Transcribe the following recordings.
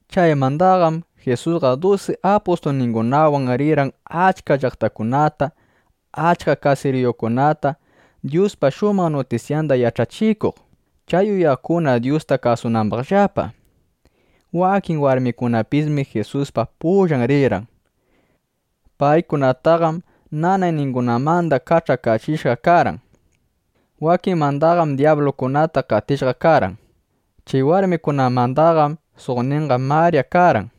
Chaymandaqam Jisusqa dusi apustulningunawan rirqan achka llaqtakunata, achka kasiriyukunata, Dyuspa shumaq nutisyanda yach'achikuq, chay uyaqkuna Dyusta kasunambaqllapa. Wakin warmikunapismi Jisuspa pullan rirqan. Paykunataqam nanayningunamanda kach'akachishqa karqan. Wakinmandaqam dyablukunata qatishqa karqan. Chay warmikunamandaqam suqninqa Marya karqan.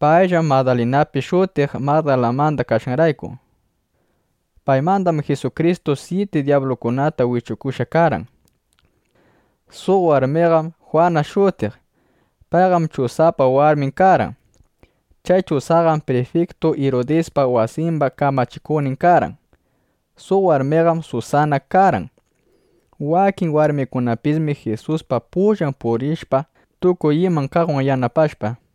Payllam Madalinapis shutiq (Magdalamanda kashqanrayku). Paymandam Jisukristu syiti dyablukunata wichukushqa karqan. Suq warmiqam Jwana shutiq. Payqam Chusapa warmin karqan. Chay Chusaqam prifiktu Irudispa wasimba kamachikuqnin karqan. Suq warmiqam Susana karqan. Wakin warmikunapismi Jisuspa pullan puriqllapa tukuy iman kaqwan yanapashpa.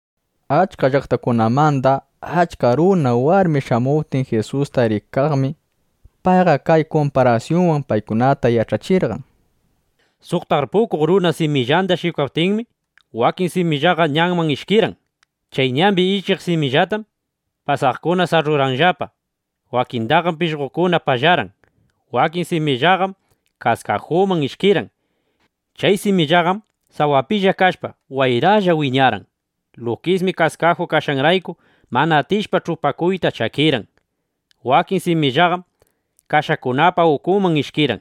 Achka llaqtakunamanda achka runa, warmi shamuptin Jisusta rikaqmi, payqa kay kumparasyunwan paykunata yach'achirqan: —Suq tarpukuq runa simillanda shikwaptinmi, wakin simillaqa ñanman ishkirqan. Chay ñambi ishkiq simillatam pasaqkuna sarrurqanllapa; wakindaqam pishqokuna pallarqan. Wakin simillaqam kaskajuman ishkirqan. Chay simillaqam sawapilla kashpa, wayralla wiñarqan. Lukismi kaskaju kashqanrayku, mana atishpa ch'upakuyta, chakirqan. Wakin simillaqam kashakunapa ukunman ishkirqan.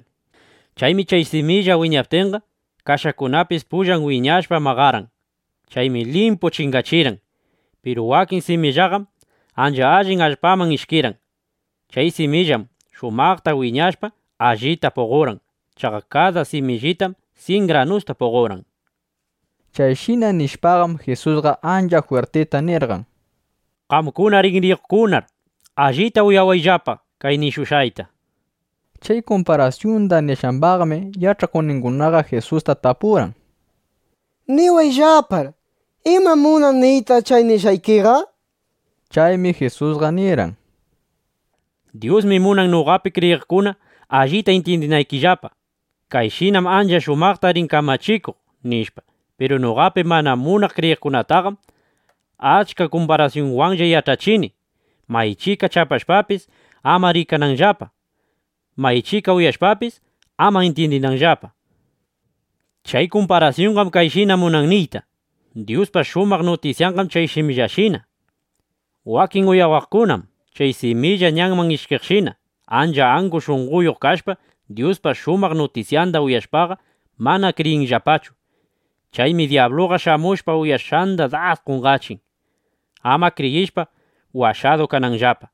Chaymi chay similla wiñaptinqa, kashakunapis pullan wiñashpa maqarqan. Chaymi limpu chingachirqan. Piru wakin simillaqam ancha allin allpaman ishkirqan. Chay simillaqam shumaqta wiñashpa, allita puqorqan. Chaqa kada simillitam syin granusta puqorqan. Chayshina nishpaqam, Jisusqa ancha jwirtita nirqan: —¡Qamkuna rinriyuqkunaqar allita uyawayllapa kay nishushqayta! nishpa. Chay kumparasyunda nishqambaqmi yach'akuqninguna Jisusta tapurqan: —Niwayllapar, ¿imam munan niyta chay nishqaykiqa? nishpa. Chaymi Jisusqa nirqan: —Dyusmi munan noqapi kriyiqkuna allita intyindinaykillapa: Kayshinam ancha shumaqta rin kamachikuq, nishpa. Piru noqapi mana munaq kriyiqkunataqam achka kumparasyunwanlla yach'achini, maychika chapashpapis, ama rikananllapa, maychika uyashpapis, ama intyindinanllapa. ’Chay kumparasyunqam kayshina munan niyta: Dyuspa shumaq nutisyanqam chay simillashina. Wakin uyawaqkunam chay similla ñanman ishkiqshina. Ancha angu shunqoyuq kashpa, Dyuspa shumaq nutisyanda uyashpaqa, mana kriyinllapachu. Chaymi dyabluqa shamushpa, uyashqanda das qonqachin, ama kriyishpa washadu kananllapa.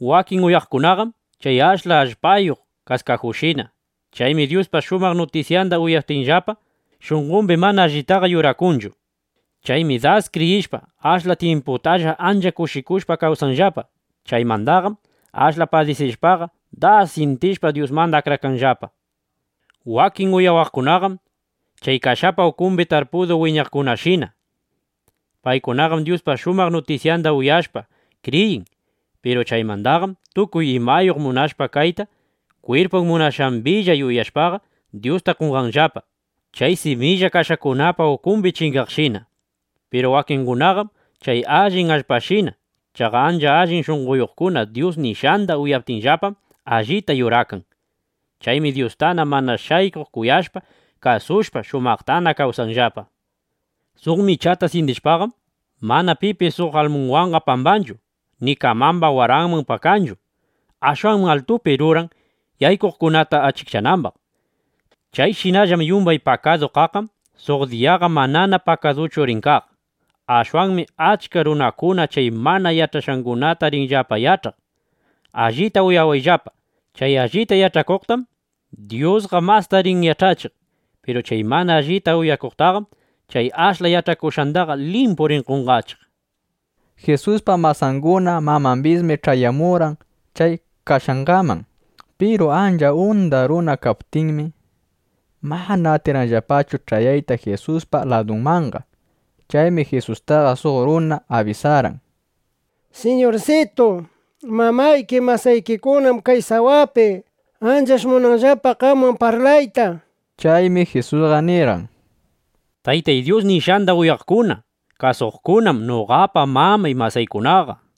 Wakin uyawaqkunaqam chay ashla allpayuq kaskajushina. Chaymi Dyuspa shumaq nutisyanda uyaptinllapaqa, shunqombi mana allitaqa yurakanchu. Chaymi das kriyishpa, ashla tyimputalla ancha kushikushpa kawsanllapa. Chaymandaqam ashla padisishpaqa, das syintishpa, Dyusmanda akrakanllapa. Wakin uyawaqkunaqam chay kashapa ukumbi tarpudu wiñaqkunashina. Paykunaqam Dyuspa shumaq nutisyanda uyashpa kriyin. Piru chaymandaqam tukuy imayuq munashpa kayta, kwirpun munashqambilla yuyashpaqa, Dyusta qonqanllapa, chay similla kashakunapa ukumbi chingaqshina. Piru wakingunaqam chay allin allpashina. Chaqa ancha allin shunqoyuqkuna Dyus nishqanda uyaptinllapam, allita yurakan. Chaymi Dyustana mana shaykuq kuyashpa, kasushpa, shumaqtana kawsanllapa. ’Suq michata syindishpaqam, mana pipis suq almunwanqa pambanchu ni kamamba waranman pakanchu. Ashwanmi altupi ruran, yaykuqkunata achikchanambaq. Chayshinallam yumbay pakadu kaqqam suq diyaqa manana pakaduchu rin kaq. Ashwanmi achka runakuna chay mana yach'ashqangunata rinllapa yach'aq. Allita uyawayllapa, chay allita yach'akuqtam Dyusqa masta rin yach'achiq. Piru chay mana allita uyakuqtaqam chay ashla yach'akushqandaqa limpu rin qonqachiq. Jisuspa masanguna mamambismi ch'ayamurqan chay kashqanman. Piru ancha unda runa kaptinmi, mana atirqanllapachu ch'ayayta Jisuspa ladunmanqa. Chaymi Jisustaqa suq runa abisarqan: —Siñursitu, mamayki masaykikunam kay sawapi. Anchash munanllapa qamwan parlayta, nishpa. Chaymi Jisusqa nirqan: —Taytay Dyus nishqanda uyaqkuna kasuqkunam noqapa mamay, masaykunaqa, nishpa.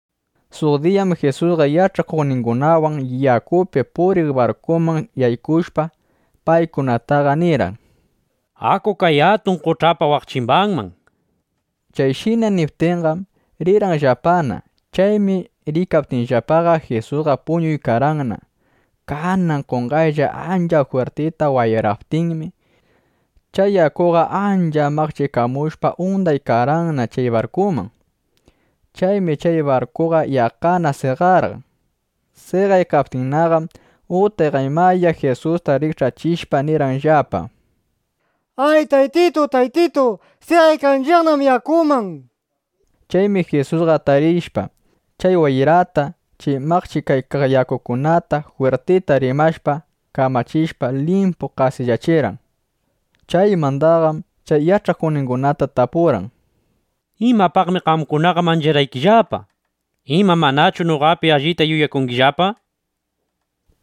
Suq diyam Jisusqa yach'akuqningunawan yakupi puriq barkuman yaykushpa, paykunata nirqan: —Aku kay atun qoch'apa waq chimbanman, nishpa. Chayshina niptinqam, rirqanllapana. Chaymi riykaptinllapaqa, Jisusqa puñurqanna. Kanan qonqaylla ancha jwirtita wayraptinmi, chay yakuqa ancha maqchikamushpa, undaykarqanna chay barkuman. Chaymi chay barkuqa yaqqana seqarqan. Seqaykaptinnaqam utqaymaya Jisusta rikch'achishpa nirqanllapa: —¡Ay, Taytitu, Taytitu! ¡Seqaykanchiqnam yakuman! nishpa. Chaymi Jisusqa atarishpa, chay wayrata, chay maqchikaykaq yakukunata jwirtita rimashpa, kamachishpa, limpu qasillachirqan. Chaymandaqam chay yach'akuqningunata tapurqan: —¿Imapaqmi qamkunaqa mancharqaykillapa? ¿Ima manachu noqapi allita yuyakungillapa? nishpa.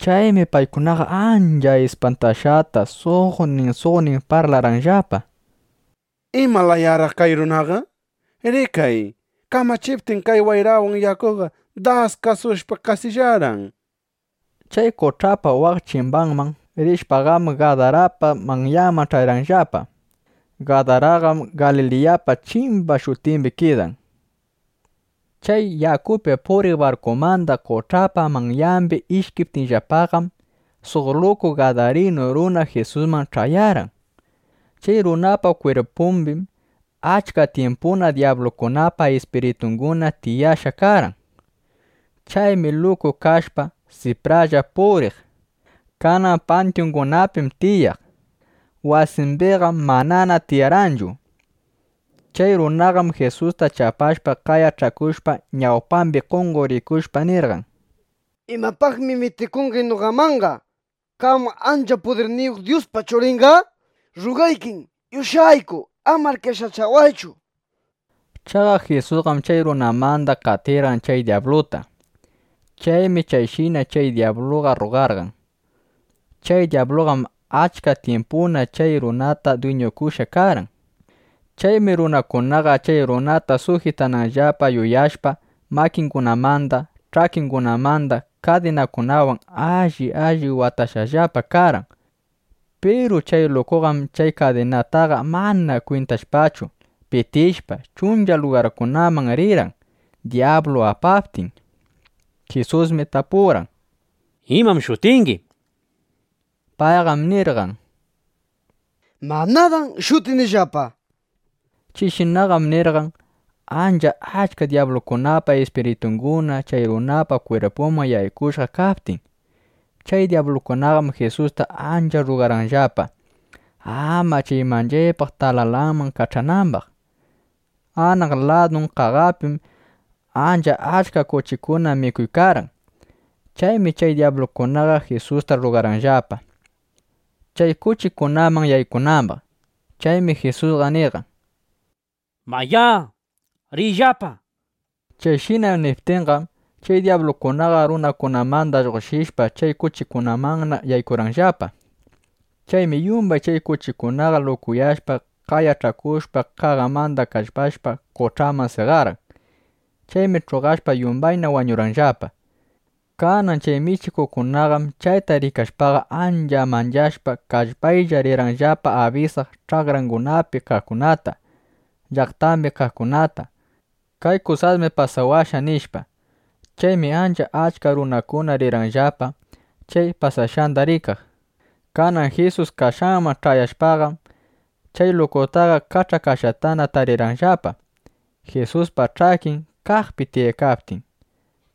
Chaymi paykunaqa ancha ispantashqata, suqnin suqnin parlarqanllapa: —¿Ima layaraq kay runaqa? ¡Rikay, kamachiptin kay wayrawan yakuqa das kasushpa, qasillarqan! nishpa. Chay qoch'apa waq chimbanman rishpaqam, Gadarapa manyanman ch'ayarqanllapa. Gadaraqam Galiliyapa chimba shutimbi kidan. Chay yakupi puriq barkumanda qoch'apa manyambi ishkiptinllapaqam, suq luku gadarinu runa Jisusman ch'ayarqan. Chay runapa kwirpumbim achka tyimpuna dyablukunapa ispiritunguna tiyashqa karqan. Chaymi luku kashpa, sipralla puriq. Kanan pantyungunapim tiyaq. Wasimbiqam manana tiyarqanchu. Chay runaqam Jisusta chapashpa, qayach'akushpa, ñawpambi qonqorikushpa nirqan: —¿Imapaqmi mitikungi noqamanqa, qam ancha pudirniyuq Dyuspa Churinqa? Rrugaykim, yush'ayku, amar qesachawaychu, nishpa. Chaqa Jisusqam chay runamanda qatiykarqan chay dyabluta. Chaymi chayshina chay dyabluqa rrugarqan. Chay dyabluqam achka tyimpuna chay runataqa dwiñukushqa karqan. Chaymi runakunaqa chay runata sujitananllapa yuyashpa, makingunamanda, ch'akingunamanda kadinakunawan alli alli watashqallapa karqan. Piru chay lukuqam chay kadinataqa mana kwintashpachu, pitishpa, chuncha lugarkunaman rirqan, dyablu apaptin. Jisusmi tapurqan: —¿Imam shutingi? nishpa. Payqam nirqan: —Manadam shutinillapa, nishpa. Chayshinaqam nirqan, ancha achka dyablukunapa ispiritunguna chay runapa kwirpunman yaykushqa kaptin. Chay dyablukunaqam Jisusta ancha rrugarqanllapa, ama chay manchaypaq talalanman kach'anambaq. Anaq ladun qaqapim ancha achka kuchikuna mikuykarqan. Chaymi chay dyablukunaqa Jisusta rrugarqanllapa, chay kuchikunaman yaykunambaq. Chaymi Jisusqa nirqan: —Mayá, riyllapa, nishpa. Chayshina niptinqam, chay dyablukunaqa runamanda lluqshishpa, chay kuchikunamanna yaykurqanllapa. Chaymi yumbay chay kuchikunaqa, lukuyashpa, qayach'akushpa, qaqamanda kallpashpa, qoch'aman seqarqan. Chaymi ch'uqashpa yumbayna wañurqanllapa. Kanan chay michiqkunaqam chayta rikashpaqa, ancha manchashpa, kallpaylla rirqanllapa abisaq ch'akrangunapi kaqkunata, llaqtambi kaqkunata: —Kay kusasmi pasawashqa, nishpa. Chaymi ancha achka runakuna rirqanllapa, chay pasashqanda rikaq. Kanan Jisus kashqanman ch'ayashpaqam, chay lukutaqa kach'akashqatana tarirqanllapa, Jisuspa ch'akin kaqpi tiyaykaptin.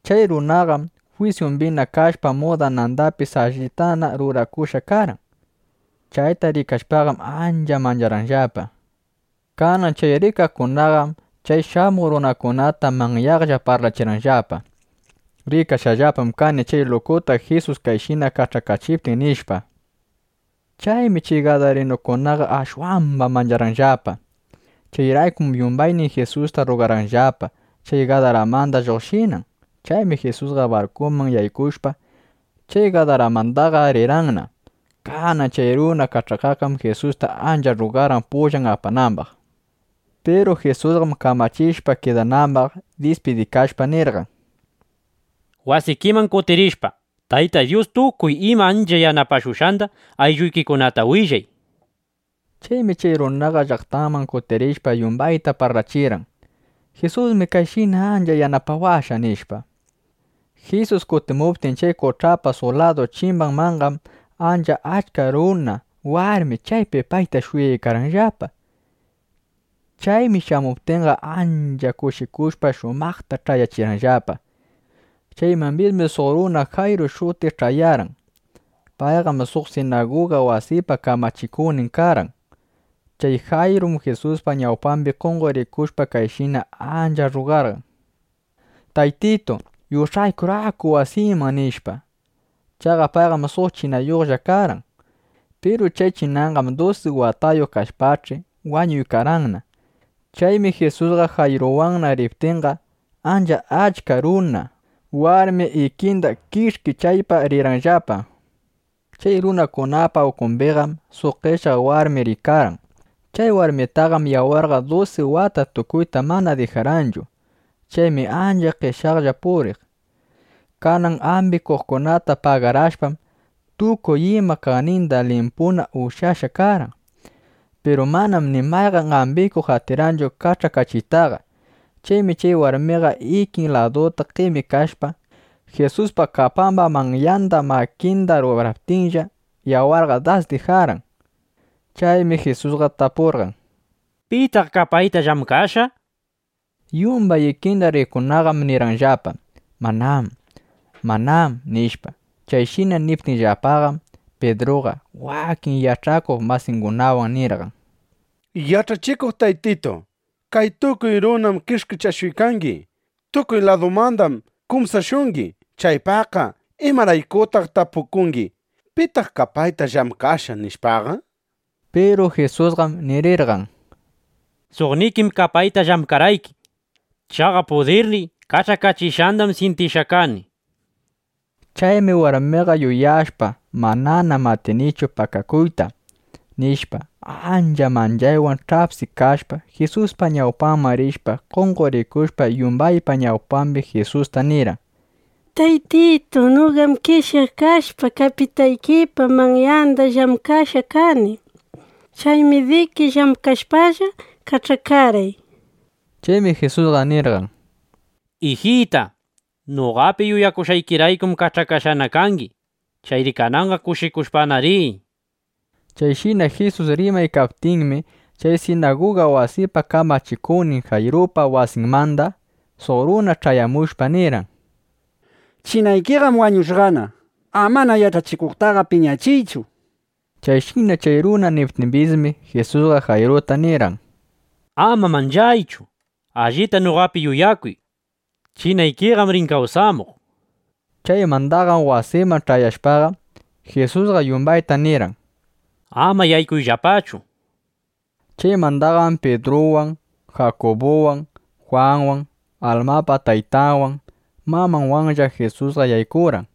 Chay runaqam jwisyumbina kashpa, mudanandapis allitana rurakushqa karqan. Chayta rikashpaqam, ancha mancharqanllapa. Kanan chay rikaqkunaqam chay shamuq runakunata manyaqlla parlachirqanllapa: —Rikashqallapam kani chay lukuta Jisus kayshina kach'akachiptin, nishpa. Chaymi chay gadarinukunaqa ashwamba mancharqanllapa. Chayraykum yumbaynin Jisusta rrugarqanllapa, chay Gadaramanda lluqshinan. Chaymi Jisusqa barkuman yaykushpa, chay Gadaramandaqa rirqanna. Kanan chay runa kach'akaqqam Jisusta ancha rrugarqan pullan apanambaq. Piru Jisusqam kamachishpa kidanambaq, dispidikashpa nirqan: —Wasikiman kutirishpa, Tayta Dyus tukuy ima ancha yanapashushqanda aylluykikunata willay, nishpa. Chaymi chay runaqa llaqtanman kutirishpa, yumbayta parlachirqan: —Jisusmi kayshina ancha yanapawashqa, nishpa. Jisus kutimuptin chay qoch'apa suq ladu chimbanmanqam, ancha achka runa, warmi chaypi payta shuyaykarqanllapa. Chaymi shamuptinqa, ancha kushikushpa, shumaqta ch'ayachirqanllapa. Chaymambismi suq runa Jayru shutiq ch'ayarqan. Payqam suq sinaguga wasipa kamachikuqnin karqan. Chay Jayrum Jisuspa ñawpambi qonqorikushpa, kayshina ancha rrugarqan: —Taytitu, yush'aykur aku wasiyman, nishpa. Chaqa payqam suq chinayuqlla karqan. Piru chay chinanqam dusi watayuq kashpach'i, wañuykarqanna. Chaymi Jisusqa Jayruwanna riptinqa, ancha achka runa, warmi ikinda kish'kichaypa rirqanllapa. Chay runakunapa ukumbiqam suq qeshyaq warmi riykarqan. Chay warmitaqam yawarqa dusi wata tukuyta mana dijarqanchu. Chaymi ancha qeshyaqlla puriq. Kanan ambikuqkunata pagarashpam, tukuy ima kaqninda limpuna ushyashqa karqan. Piru manam ni mayqan ambikuq atirqanchu kach'akachiytaqa. Chaymi chay warmiqa ikin laduta qemikashpa, Jisuspa kapamba manyanda makinda ruraptinlla, yawarqa das dijarqan. Chaymi Jisusqa tapurqan: —¿Pitaq kapayta llamkashqa? nishpa. Yumbay ikinda riqkunaqam nirqanllapa: —Manam, manam, nishpa. Chayshina niptinllapaqam, Pidruqa ˻wakin yach'akuq masingunawan˼ nirqan: —Yach'achikuq Taytitu, kay tukuy runam kish'kichashuykangi. Tukuy ladumandam kumsashungi. Chaypaqqa ¿imaraykutaq tapukungi: “¿Pitaq kapayta llamkashqa?” nishpaqa? Piru Jisusqam nirirqan: —Suqnikim kapayta llamkarqayki. Chaqa pudirniy kach'akachishqandam syintishqa kani, nishpa. Chaymi warmiqa yuyashpa: Mananam atinichu pakakuyta, nishpa, ancha manchaywan ch'apsikashpa, Jisuspa ñawpanman rishpa, qonqorikushpa, yumbaypa ñawpambi Jisusta nirqan: —Taytitu, noqam qeshyaq kashpa, kapitaykipa manyanda llamkashqa kani. Chaymi diki llamkashpalla kach'akarqay, nishpa. Chaymi Jisusqa nirqan: —Ijita, noqapi yuyakushqaykiraykum kach'akashqana kangi. Chayri kananqa kushikushpana riy, nishpa. Chayshina Jisus rimaykaptinmi, chay sinaguga wasipa kamachikuqnin Jayrupa wasinmanda suq runa ch'ayamushpa nirqan: —Chinaykiqam wañushqana. Amana Yach'achikuqtaqa piñachiychu, nishpa. Chayshina chay runa niptimbismi, Jisusqa Jayruta nirqan: —Ama manchaychu. Allita noqapi yuyakuy. Chinaykiqam rin kawsamuq, nishpa. Chaymandaqam wasinman ch'ayashpaqa, Jisusqa yumbayta nirqan: —Ama yaykuyllapachu, nishpa. Chaymandaqam Pidruwan, Jakubuwan, Jwanwan, almapa taytanwan mamanwanlla Jisusqa yaykurqan.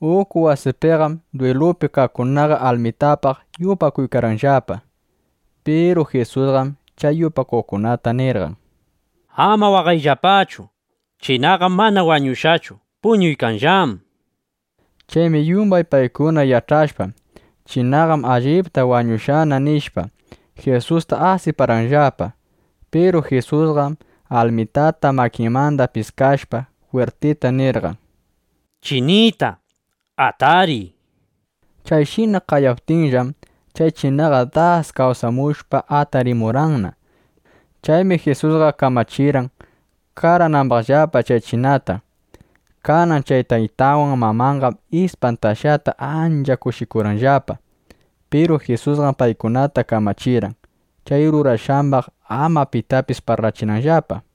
Uku wasipiqam dwilupi kaqkunaqa almitapaq yupakuykarqanllapa. Piru Jisusqam chay yupakuqkunata nirqan: —Ama waqayllapachu. Chinaqam mana wañushqachu. Puñuykanllám, nishpa. Chaymi yumbay paykuna yach'ashpa: Chinaqam allipta wañushqana, nishpa, Jisustaqa asiparqanllapa. Piru Jisusqam almitata makinmanda piskashpa, jwirtita nirqan: —¡Chinita, atariy! nishpa. Chayshina qayaptinllam, chay chinaqa das kawsamushpa, atarimurqanna. Chaymi Jisusqa kamachirqan, qaranambaqllapa chay chinata. Kanan chay taytanwan mamanqam ispantashqata ancha kushikurqanllapa. Piru Jisusqam paykunata kamachirqan, chay rurashqambaq ama pitapis parlachinanllapa.